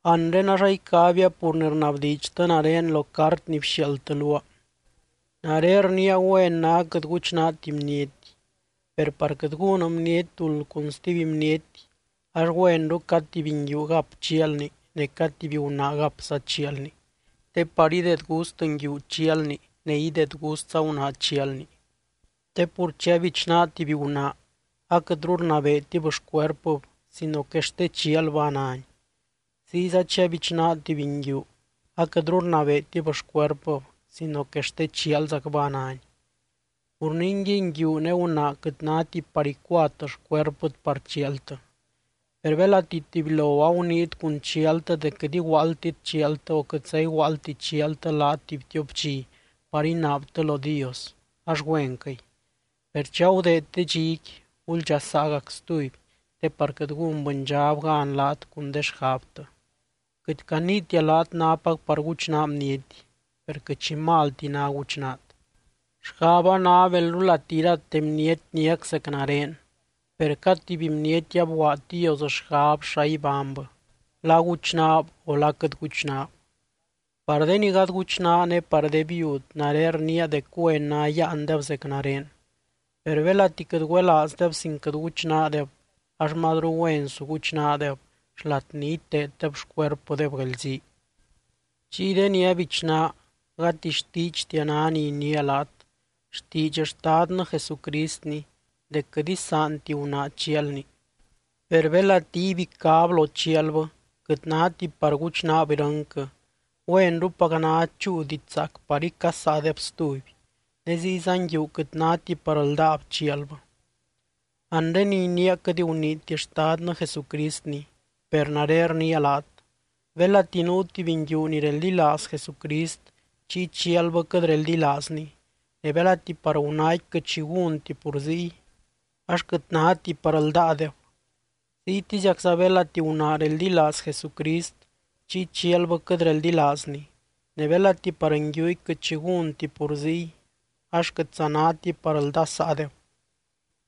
Anre ax aicabia pur ni rnabdiidxtɨ nare lo cart ni bxiaaldtɨ luaa. Nare rniia güen ná quɨt guchnaati bniety. Per par quɨt gún bniety duld cun stuby bniety, ax güenru cad tuby nguiu gap chialni ne cad tuby gunaa gapza chialni, te par ideed gust nguiu chialni ne ideed gustza gunaa chialni. Te pur chi abichnaa tuby gunaa, aquɨtru rnabeetib xcuerpɨb sino que xte chialbɨ a náni. Ziyza chi abichnaa tuby nguiu, aquɨtru rnabeetib xcuerpɨb sino que xte chialzacbɨ a náni. Pur ningui, nguiu ne gunaa quɨt náti par icuat xcuerpɨt par chialtɨ. Per belati tubylo aguniit cun chialtɨ dec quɨt iguaaldtit chialtɨ o quɨtza iguaaldti chialtɨ laat tuby tiop dxi par inaabtɨ lo Dios, ax güenquɨy. Per chi agudeed de dxiqui, guldxasaagac stuby te par quɨt gún bɨndxab gan laat cun de xgabtɨ. Quɨt caniitia laat nápac par guchnaa bniety, per quɨt xi malti ná guchnaat. Xgaba ná belrulati irate bniety niac zec nare, per cad tuby bniety abguaad Dios xgab xa ibánybɨ, la guchnaab o la quɨt guchnaab. Par de ni gady guchnaa ne par de viud, nare rniia dec güen ná yáandeb zec nare. Per belati quɨt güelaazdeb sin quɨt guchnaadeb, ax mazru güen su guchnaadeb xlat ni iteeddeb xcuerpɨdeb guelzii. Chiy de ni abichnaa, gati xtiidxtia ná ni iniia laat, xtiidx Xtadnɨ Jesucristni dec quɨt isaanti gunaa chialni. Per belati ibicáb lo chialbɨ quɨt náti par guchnaab irɨnquɨ, güenrupac ná chúu diidx zaac par icasaadeb stuby. Ne ziyza nguiu quɨt náti par ldáab chialbɨ. Anre ni iniia quɨt guniiti Xtadnɨ Jesucristni, per nare rniia laat: Belati nuu tuby nguiu ni reldilaaz Jesucrist chiy chialbɨ quɨt reldilaazny, ne belati par gunaaqui quɨt xi gúnti pur ziy, ax quɨt náti par ldáadeb. Ziytiziacza belati gunaa reldilaaz Jesucrist chiy chialbɨ quɨt reldilaazny, ne belati par nguiuqui quɨt xi gúnti pur ziy, ax quɨtza náti par ldasaadeb.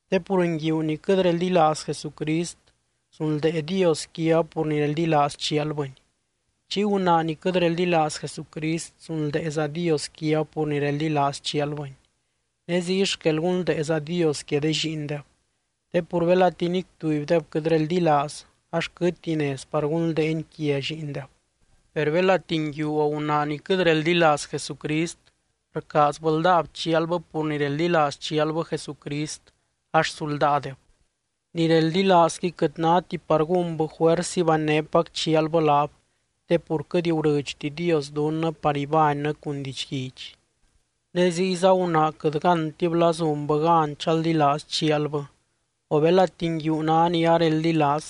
Te pur nguiu ni quɨt reldilaaz Jesucrist, zunldee Dios quiab pur ni reldilaaz chialbɨny. Chiy gunaa ni quɨt reldilaaz Jesucrist zunldeeza Dios quiab pur ni reldilaaz chialbɨny, ne ziy xquel gunldeeza Dios quia de lliindeb. Te pur belati nic tubydeb quɨt reldilaaz ax quɨtti nez par gunldeeny quia lliindeb. Per belati nguiu o gunaa ni quɨt reldilaaz Jesucrist rcaazbɨ ldáab chialbɨ pur ni reldilaaz chialbɨ Jesucrist, ax su ldáadeb. Ni reldilaazqui quɨt náti par gúnbɨ juers ibanynépac chialbɨ laab, te pur quɨt gurɨdxti Dios dunnɨ par ibánnɨ cun didxguidx. Ne ziyza gunaa quɨt gántib la zunbɨ gan chaldilaaz chialbɨ o belati nguiu ná ni areldilaaz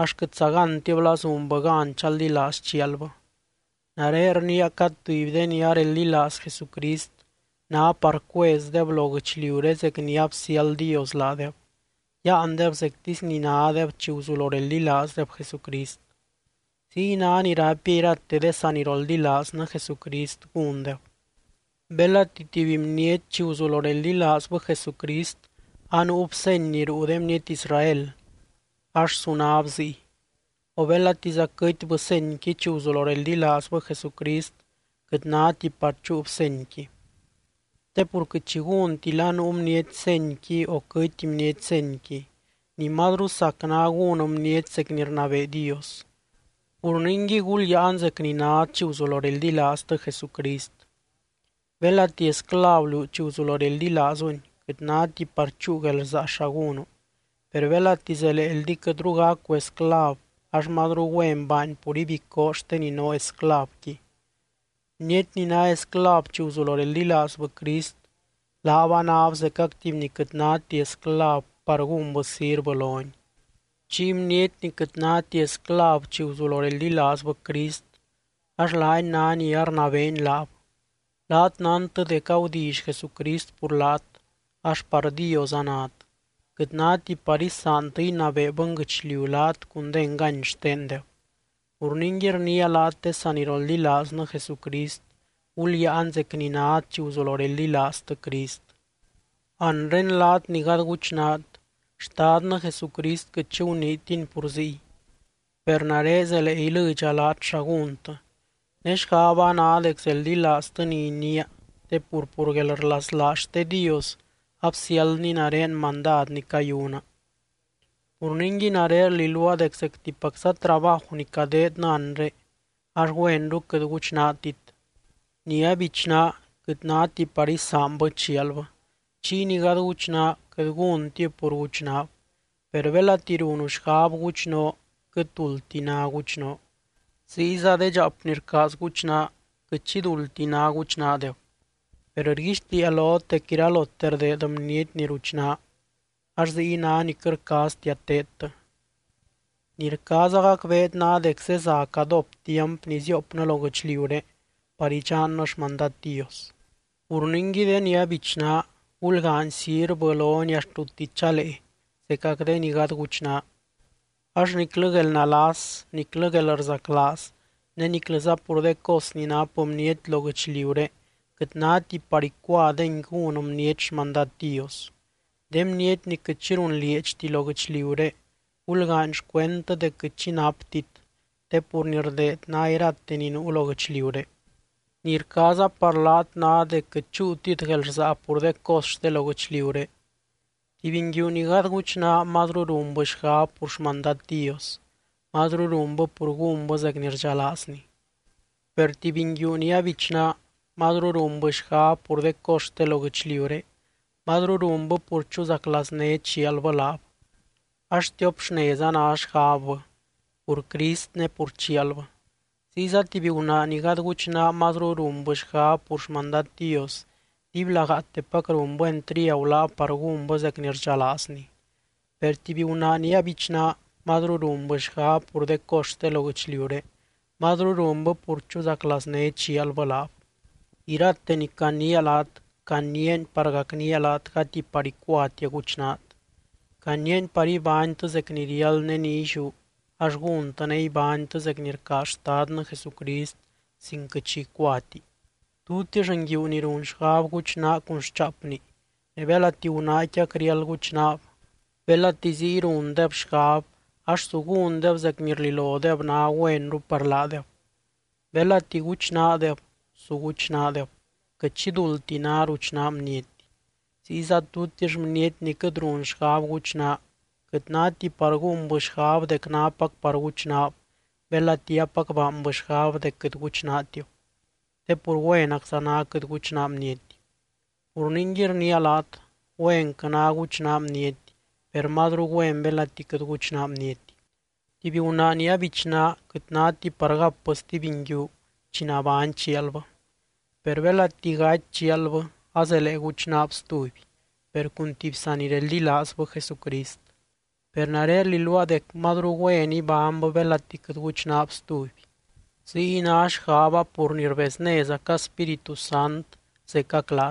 ax quɨtza gántib la zunbɨ gan chaldilaaz chialbɨ. Nare rniia cad tuby de ni areldilaaz Jesucrist, ná par cuezdeb lo guɨchliuré zec ni absiáld Dios laadeb, yáandeb zectisy ni nádeb chi guzulo reldilaazdeb Jesucrist. Ziy ná ni raipia irate de saniroldilaaznɨ Jesucrist gúndeb. Belati tuby bniety chi guzulo reldilaazbɨ Jesucrist anuub seny ni ruu de bniety Israel, ax su náb ziy. O belatiza quɨtbɨ senyqui chi guzulo reldilaazbɨ Jesucrist, quɨt náti par chúub senyqui. Te pur quɨt xi gúnti la nuu bniety senyqui o quɨty bniety senyqui, ni mazru sac ná gún bniety zec ni rnabee Dios. Pur ningui, gulyáan zec ni nát chi guzulo reldilaaztɨ Jesucrist. Belati esclav liú chi guzulo reldilaazuny, quɨt náti par chúu guelrsaa xa gúnu. Per belati zeleeldi quɨtru gacu esclav, ax mazru güen baany pur ibicoo xte ni noo esclavqui. Bniety ni ná esclav chi guzulo reldilaazbɨ Crist, laab anáb zecac tuby ni quɨt náti esclav par gúnbɨ sirvɨ lony. Chiy bniety ni quɨt náti esclav chi guzulo reldilaazbɨ Crist, ax laany ná ni arnabeeny laab. Laat nántɨ dec agudilly Jesucrist pur laat, ax par Dios anát. Quɨt náti par isaantɨ inabee bɨnguɨchliu laat cun de engany xtendeb. Pur ningui rniia laat de saniroldilaaznɨ Jesucrist, gulyáan zec ni nát chi guzulo reldilaaztɨ Crist. Anre laat ni gady guchnaat, Xtadnɨ Jesucrist quɨt xi guniitiny pur ziy. Per nare zelee ilɨdxa laat xa gúntɨ, ne xgaba ná dec zeldilaaztɨ ni iniia te pur, pur guelrlaslaaz xte Dios absiáldny nare mandad ni cayuna. Pur ningui nare rliluaa dec zectipacza trabaju ni cadeednɨ anre, ax güenru quɨt guchnaatit. Ni abichnaa, quɨt náti par isaanbɨ chialbɨ. Chiy ni gady guchnaa, quɨt gúntib pur guchnaab. Per belati runu xgab guchnoo, quɨt duldti ná guchnoo. Ziyza de dxaap ni rcaaz guchnaa, quɨt xi duldti ná guchnaadeb. Per rguixtiia lot dec iralote rdeed bniety ni ruchnaa, ax ziy ná ni quɨt rcaaztia teedtɨ. Ni rcaaza gacbeet ná dec zeza cadóp tiamp ni ziopnɨ lo guɨchliuré par idxannɨ xmandad Dios. Pur ningui de ni abichnaa, gulgaany sirvɨ lony axt rutti chalee zecac de ni gady guchnaa. Ax niclɨ guelnalas, niclɨ guelrzaclaaz ne niclɨza pur de cos ni nap bniety lo guɨchliuré quɨt náti par icuadengui gún bniety xmandad Dios. De bniety ni quɨt xi runlieedxti lo guɨchliuré, gulgaany xcuendtɨ dec quɨt xi naptit, te pur ni rdeed ná irate ni nuu lo guɨchliuré. Ni rcaaza par laat ná dec quɨt chúutit guelrsaa pur de cos xte lo guɨchliuré. Tuby nguiu ni gady guchnaa mazru runbɨ xgab pur xmandad Dios, mazru runbɨ pur gúnbɨ zec ni rdxalaazny. Per tuby nguiu ni abichnaa mazru runbɨ xgab pur de cos xte lo guɨchliuré, mazru runbɨ pur chuzaclaazné chialbɨ laab ax tiop xnez a ná xgabbɨ, pur Crist ne pur chialbɨ. Ziyza tuby gunaa ni gady guchnaa mazru runbɨ xgab pur xmandad Dios, dibylagaatepac runbɨ entriagu laab par gúnbɨ zec ni rdxalaazny. Per tuby gunaa ni abichnaa mazru runbɨ xgab pur de cos xte lo guɨchliuré, mazru runbɨ pur chuzaclaazné chialbɨ laab. Irate ni caniia laat, caniiani par gacnía laat gati par icuatia guchnaat, caniiani par ibánytɨ zec ni riáld ne ni illiú ax gúntɨ ne ibánytɨ zec ni rcaaz Xtadnɨ Jesucrist sin quɨt xi icuati. Tutix nguiu ni run xgab guchnaa cun xchaapni ne belati gunaaqui acriáld guchnaab, belati ziy rundeb xgab ax su gúndeb zec ni rlilodeb ná güenru par laadeb. Belati guchnaadeb, su guchnaadeb. Quɨt xi duldti ná ruchnaa bniety. Ziyza tutix bniety ni quɨt run xgab guchnaa, quɨt náti par gúnbɨ xgab dec nápac par guchnaab belati apac baanbɨ xgab dec quɨt guchnaatib. Te pur güenacza ná quɨt guchnaa bniety. Pur ningui rniia laat, güenquɨ ná guchnaa bniety, per mazru güen belati quɨt guchnaa bniety. Tuby gunaa chi abichnaab, quɨt náti par gapbɨ stuby nguiu chi nabány chialbɨ. Per belati gaty chialbɨ azelee guchnaab stuby, per cun tuby sanireldilaazbɨ Jesucrist. Per nare rliluaa dec mazru güen ibánybɨ belati quɨt guchnaab stuby. Ziy ná xgaba pur ni rbeznézaca Spíritu Sant zecac laat.